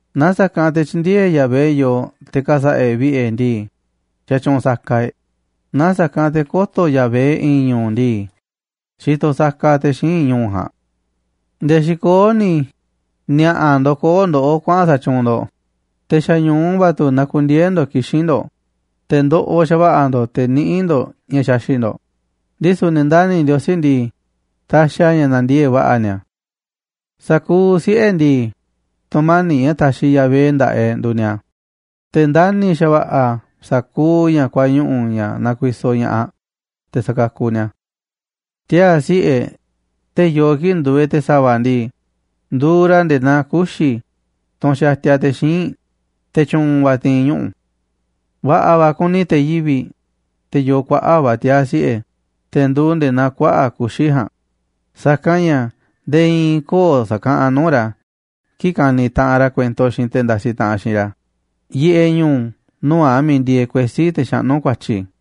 Naaꞌ sa̱kanꞌ te̱ tyï̱ndi̱e̱eꞌ Yahvé yooꞌ te̱ ka̱sa̱ꞌa̱ e̱ꞌ vi̱ꞌe̱ e̱ꞌ ndii, xatyuunꞌ saka e̱ꞌ, naaꞌ sa̱kanꞌ te̱ kö̱to̱ Yahvé i̱i̱n ñu̱u̱ ndii, xitoꞌ saka te̱ xíinꞌ ñu̱u̱ ja̱a̱nꞌ. Nde̱e̱ xikoó ni̱ ni̱a̱ꞌa̱ ndokoó ndoꞌó kuaꞌa̱n sa̱tyuunꞌ ndo̱ꞌ, te̱ xa̱ñu̱u va̱ tu̱ nakundieé ndo̱ꞌ kixín ndo̱ꞌ, te̱ ndoꞌoꞌ xa̱va̱ꞌa̱ ndo̱ꞌ te̱ niꞌíꞌ ndo̱ꞌ ña̱ xaxi̱ꞌ ndo̱ꞌ, ndisu̱ ne̱ ndani̱ Ndiosí ndii, taxiꞌ a̱ ña̱ nandiee̱ꞌ va̱ꞌa̱ ni̱a̱. Sa̱kuuꞌ siꞌe̱ e̱ꞌ ndii, tu̱mani̱ꞌ ña̱ taxiꞌ Yahvé nda̱ꞌaꞌ e̱ꞌ nduuꞌ ni̱a̱, te̱ ndani̱ xa̱va̱ꞌa̱ a̱ sa̱kuuꞌ ña̱ kuañuꞌu̱, ña̱ nakuisoꞌ ña̱ꞌaꞌ, te̱ sakakuꞌ ni̱a̱ a̱. Tiaa̱ siꞌe̱ e̱ꞌ, te̱ yoo kii̱ꞌ nduuꞌ e̱ꞌ te̱ sa̱va̱ ndii, nduuꞌ ra̱ nde̱e̱ naa kuxi̱, tunꞌ xatia te̱ xíinꞌ, te̱ tyu̱u̱n va̱ ti̱i̱n ñuꞌu̱. Va̱ꞌa̱ va̱ kuni te̱ yivi̱ꞌ, te̱ yoo kuaꞌa̱ꞌ va̱ tiaa̱ siꞌe̱, te̱ nduuꞌ nde̱e̱ naa kuaꞌa̱ꞌ kuxi̱ ja̱a̱nꞌ, sa̱kanꞌ ña̱ nde̱e̱ i̱i̱n köo̱ꞌ sa̱kaꞌanꞌ nuu̱ꞌ ra̱ kii̱ꞌ ka̱ni̱ taꞌanꞌ ra̱ kuento xiinꞌ te̱ ndasiꞌ taꞌanꞌ xiinꞌ ra̱ yiꞌeꞌ ñu̱u̱ nuu̱ꞌ a̱ miiꞌ ndieeꞌ kuesí, te̱ xaꞌnú ku̱a̱tyi̱.